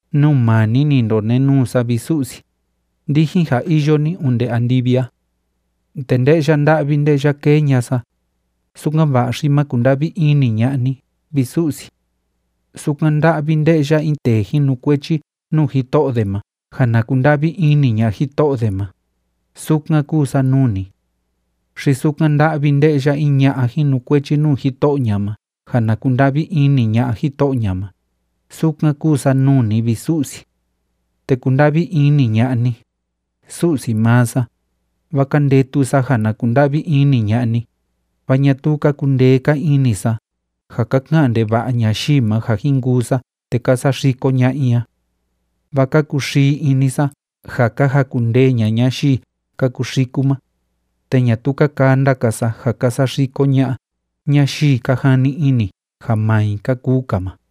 Nuu maa ni ni ndonenuu sa, vi Su'si, ndijin ja iyo ni onde andivi a. Te nde'ya nda'vi nde'ya kee ña'a sa, sukan‑va'a xi ma kunda'vi ini ña'a ni, vi Su'si. Sukan nda'vi nde'ya in tee jinukuechi nuu jito'o de ma ja na kunda'vi ini ña'a jito'o de ma, sukan kúu sa nuu ni. Xi sukan nda'vi nde'ya in ña'a jinukuechi nuu jito'o ña ma ja na kunda'vi ini ña'a jito'o ña ma, sukan kúu sa nuu ni, vi Su'si. Te kunda'vi ini ña'a ni, Su'si maa sa, vaa ka ndetu sa ja na kunda'vi ini ña'a ni, vaa ñatuu ka kundee‑ka ini sa ja ka ka'an ndeva'a ñayii ma ja jin kuu sa te ka saxiko ña'a i a. Vaa ka kuxii ini sa ja ka jakundee ña'a ñayii ka kuxiku ma, te ñatuu ka kanda‑ka sa ja ka saxiko ña'a ñayii ka jani ini ja maa i ka kuu‑ka ma.